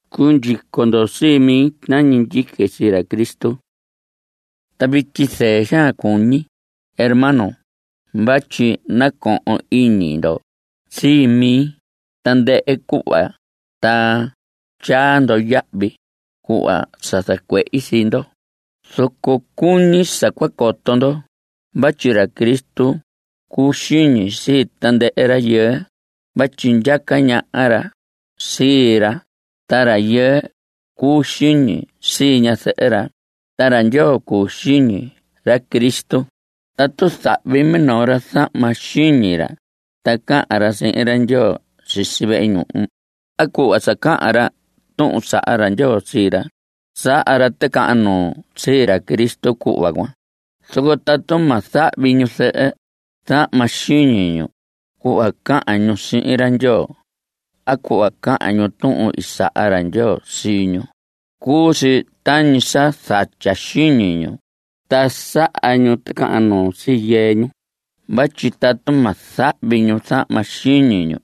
Cundyico ndo sii mi tañi ndyique sii ra Cristo. Ta vityi, zɨɨ xaan cuñi, hermanos, vatyi nacohon iñi ndo sii mi tandɨhɨ cuhva ta tyaa ndo yahvi cuhva sa zacuehi sii ndo. Zoco cuñi sa cua coto ndo vatyi ra Cristo cuu xiñi sii tandɨhɨ rayɨɨ vatyi ndyaca ñaha ra sii ra. Ta rayɨɨ cuu xiñi sii ñazɨhɨ ra. Ta ra Ndyoo cuu xiñi ra Cristo. Tatu zahvi minoo ra zahma xiñi ra ta cahan ra sihin ra Ndyoo sisi vehe ñuhu a cuhva sa cahan ra tuhun saha ra Ndyoo sii ra, saha ra ticahan nuu sii ra Cristo cuhva cuan. Zoco tatu ma zahvi ñuzɨhɨ zahma xiñi ñu cuhva cahan ñu sihin ra Ndyoo a cuhva cahan ñu tuhun i saha ra Ndyoo sii ñu, cuu si tañi sa zatya xiñi ñu. Ta saha ñu ticahan nuu sii yɨɨ ñu vatyi tatu ma zahvi ñu zahma xiñi ñu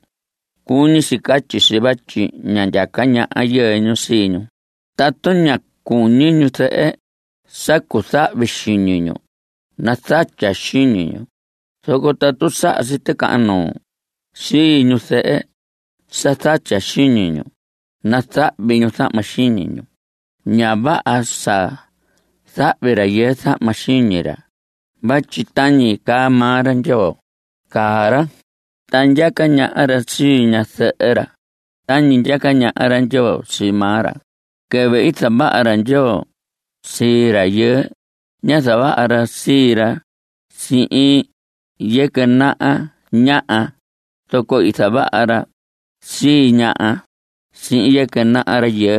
cuñi si catyi si vatyi ña ndyaca ñaha yɨɨ ñu sii ñu. Tatu ña cuñi ñuzɨhɨ sa cuzahvi xiñi ñu, nazatya xiñi ñu. Zoco tatu saha si ticahan nuu sii ñuzɨhɨ sa zatya xiñi ñu, nazahvi ñu zahma xiñi ñu. Ña vaha sa zahvi rayɨɨ zahma xiñi ra vatyi tañi caa maa ra Ndyoo caa ra. Ta ndyaca ñaha ra sii ñazɨhɨ ra tañi ndyaca ñaha ra Ndyoo sii maa ra. Quɨvɨ i zavaha ra Ndyoo sii rayɨɨ, ñá zavaha ra sii ra sihin yɨquɨ naha ñaha. Zoco i zavaha ra sii ñaha sihin yɨquɨ naha rayɨɨ.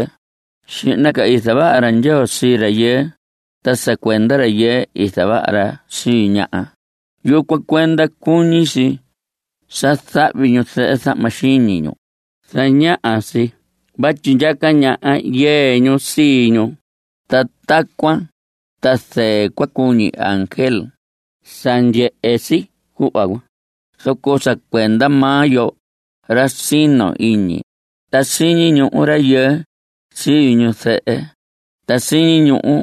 Xihna ca i zavaha ra Ndyoo sii rayɨɨ. Ta sa cuenda rayɨɨ i zavaha ra sii ñaha. Yucuan cuenda cuñi si sa zahvi ñuzɨhɨ zahma xiñi ñu. Zañaha si vatyi ndyaca ñaha yɨɨ ñu sii ñu. Ta tacuan ta zɨɨ cua cuñi ángel sa ndyehe si cuhva cuan. Zoco sa cuenda maa yo, ra sino iñi, ta siñi ñuhu rayɨɨ sii ñu zɨhɨ, ta siñi ñuhu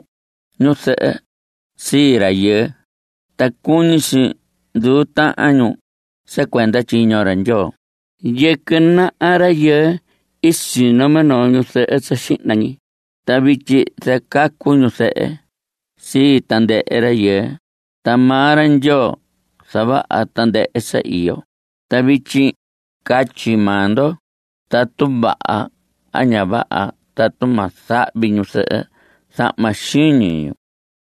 ñu zɨhɨ sii rayɨɨ. Ta cuñi si nduu tahan ñu sa cuenda tyiño ra Ndyoo. Yɨquɨ naha rayɨɨ i sino minoo ñu zɨhɨ sa xihna ñi, ta vityi zacacu ñu zɨhɨ sii tandɨhɨ rayɨɨ. Ta maa ra Ndyoo zavaha tandɨhɨ sa iyo. Ta vityi catyi maa ndo tatu vaha a ña vaha tatu ma zahvi ñuzɨhɨ zahma xiñi ñu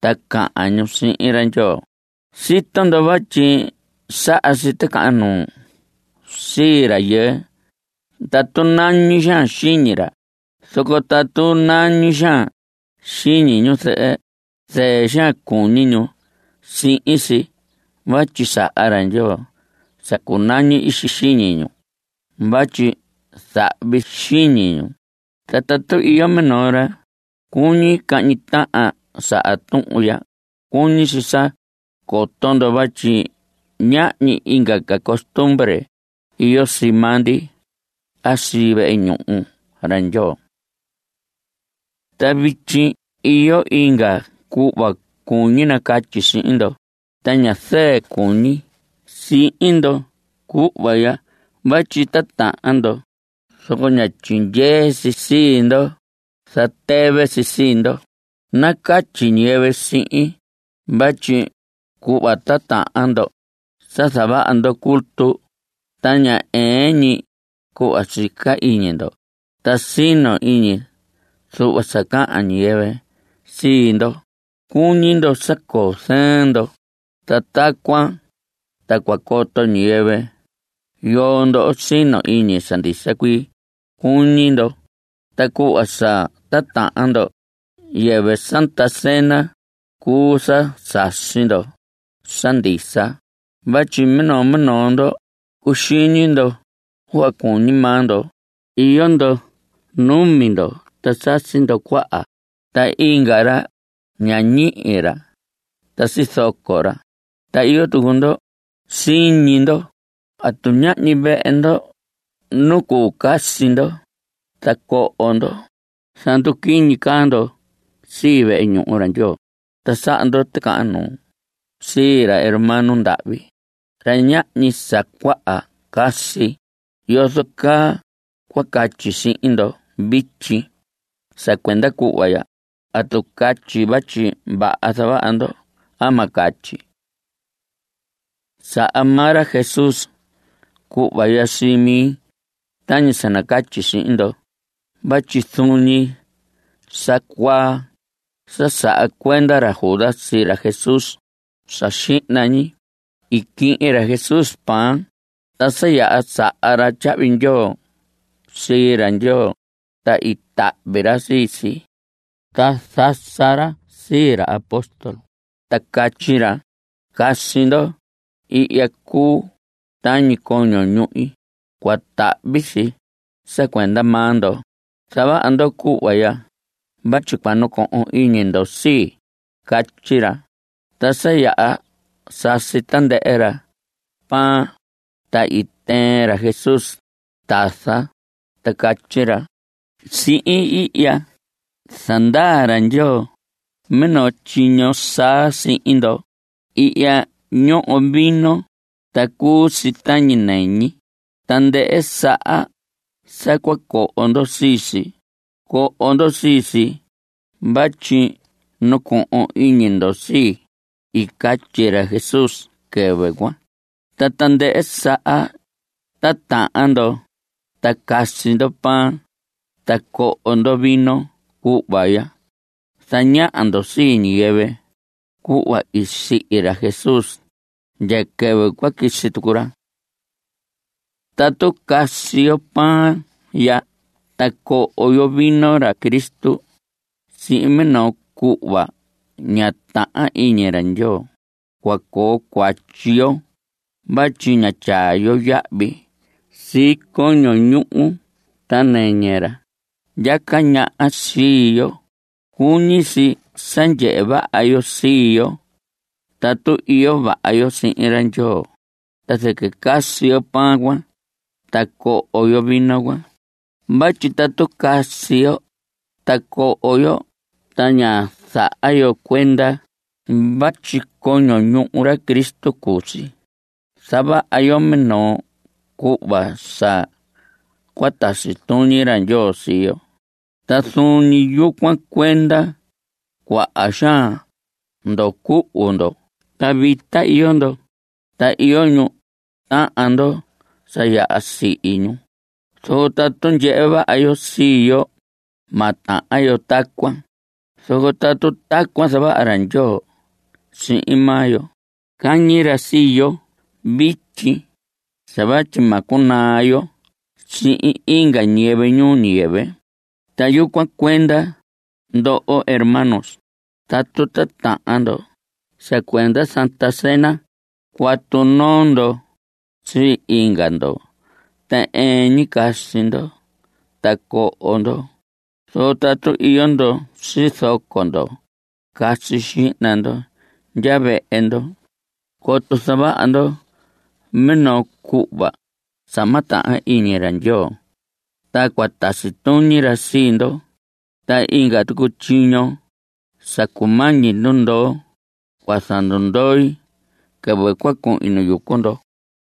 ta cahan ñu sihin ra Ndyoo. Sito ndo vatyi saha si ticahan nuu sii rayɨɨ tatu nañi xaan xiñi ra. Zoco tatu nañi xaan xiñi ñu zɨhɨ, zɨɨ xaan cuñi ñu sihin si vatyi saha ra Ndyoo sa cunañi ixi xiñi ñu vatyi zahvi si xiñi ñu. Ta tatu iyo minoo ra cuñi cahñi tahan saha tuhun ya, cuñi si sa coto ndo vatyi ñahñi inga ca costumbre iyo sii maa ndi a sii vehe ñuhu ra Ndyoo. Ta vityi iyo inga cuhva cuñi nacatyi sihin ndo. Ta ña zɨɨ cuñi sihin ndo cuhva ya vatyi titahan ndo, zoco ña tyindyee si sii ndo. Zatɨvɨ si sii ndo. Nacatyi ñiyɨvɨ sihin, vatyi cuhva titahan ndo sa zavaha ndo culto ta ña ɨɨn ñi cuhva sica iñi ndo. Ta sino iñi zuhva sa cahan ñiyɨvɨ sii ndo. Cuñi ndo sa coo zɨɨn ndo, ta tacuan ta cua coto ñiyɨvɨ yoo ndo sino iñi sa ndisa cuii, cuñi ndo. Ta cuhva sa titahan ndo, yɨvɨ Santa Cena cuu sa sasi ndo sa ndisa vatyi minoo minoo ndo cuxiñi ndo cuhva cuñi maa ndo. Iyo ndo numi ndo ta sasi ndo cuaha, ta inga ra ña ñihi ra ta sizoco ra. Ta iyo tucu ndo siñi ndo. ¿Atu ñahñi vehe ndo nu cuu casi ndo ta coho ndo? Zanduquiñi caa ndo sii vehe ñuhu ra Ndyoo, ta saha ndo ticahan nuu sii ra hermano ndahvi, ra ñahñi sa cuaha casi. ¿Yozo caa cua catyi sihin ndo vityi sa cuenda cuhva ya? ¿Atu catyi vatyi vaha zavaha ndo? Ma catyi. Saha maa ra Jesús cuhva ya sii mi tañi sa nacatyi sihin ndo vatyi zuun ñi sa cuaa sa saha cuenda ra Judas sii ra Jesús, sa xihna ñi i quihin ra Jesús pan. Ta sa yaha saha ra tyahvi ndyoo sii ra Ndyoo, ta i tahvi ra sii si, ta zasa ra sii ra apóstol, ta catyi ra: “Casi ndo. Ihya cuu tañi coño ñuhi. Cua tahvi si sa cuenda maa ndo. Zavaha ndo cuhva ya vatyi cua nacohon iñi ndo sii.” Catyi ra. Ta sa yaha sasi tandɨhɨ ra pan, ta i tɨɨn ra Jesús tasa ta catyi ra: “Sihin ihya zandaa ra Ndyoo minoo tyiño saa sihin ndo. Ihya ñoho vino ta cuu si tañi nɨñi. Tandɨhɨ saha sa cua coho ndo sii si, coho ndo sii si vatyi nacohon iñi ndo sii.” I catyi ra Jesús quɨvɨ cuan. Ta tandɨhɨ saha titahan ndo ta casi ndo pan ta coho ndo vino cuhva ya, zañaha ndo sii ñiyɨvɨ cuhva i sihi ra Jesús ndya quɨvɨ cua quisi tucu ra. Tatu casi yo pan ya ta coho yo vino ra Cristo sihin minoo cuhva ña tahan iñi ra Ndyoo, cua coo cuatyi yo vatyi ña tyaa yo yahvi sii coño ñuhu ta nɨñɨ ra ndyaca ñaha sii yo. Cuñi si sa ndyehe vaha yo sii yo tatu iyo vaha yo sihin ra Ndyoo, ta zɨquɨ casi yo pan cuan ta coho yo vino cuan. Vatyi tatu casi yo ta coho yo ta ña zaha yo cuenda vatyi coño ñuhu ra Cristo cuu si, zavaha yo minoo cuhva sa cua tasi tuñi ra Ndyoo sii yo. Ta zuun ñi yucuan cuenda cuaha xaan ndo cuhu ndo ta vita iyo ndo, ta iyo ñu tahan ndo sa yaha sihi ñu. Zoco tatu ndyehe vaha yo sii yo, ma tahan yo tacuan. Zoco tatu tacuan zavaha ra Ndyoo sihin maa yo, cañi ra sii yo vityi sa vatyi ma cunaa yo sihin inga ñiyɨvɨ ñuu ñiyɨvɨ. Ta yucuan cuenda, ndoho hermanos, tatu titahan ndo sa cuenda Santa Cena, cuatu noo ndo sii inga ndo ta ɨɨn ñi casi ndo ta coho ndo. Zoco tatu iyo ndo sizoco ndo, casi xihna ndo ndya vehe ndo coto zavaha ndo minoo cuhva sa ma tahan iñi ra Ndyoo ta cua tasi tuñi ra sii ndo. Ta inga tucu tyiño sa cumañi ndundoo cua zandundoi quɨvɨ cua cuhin nu yucu ndo.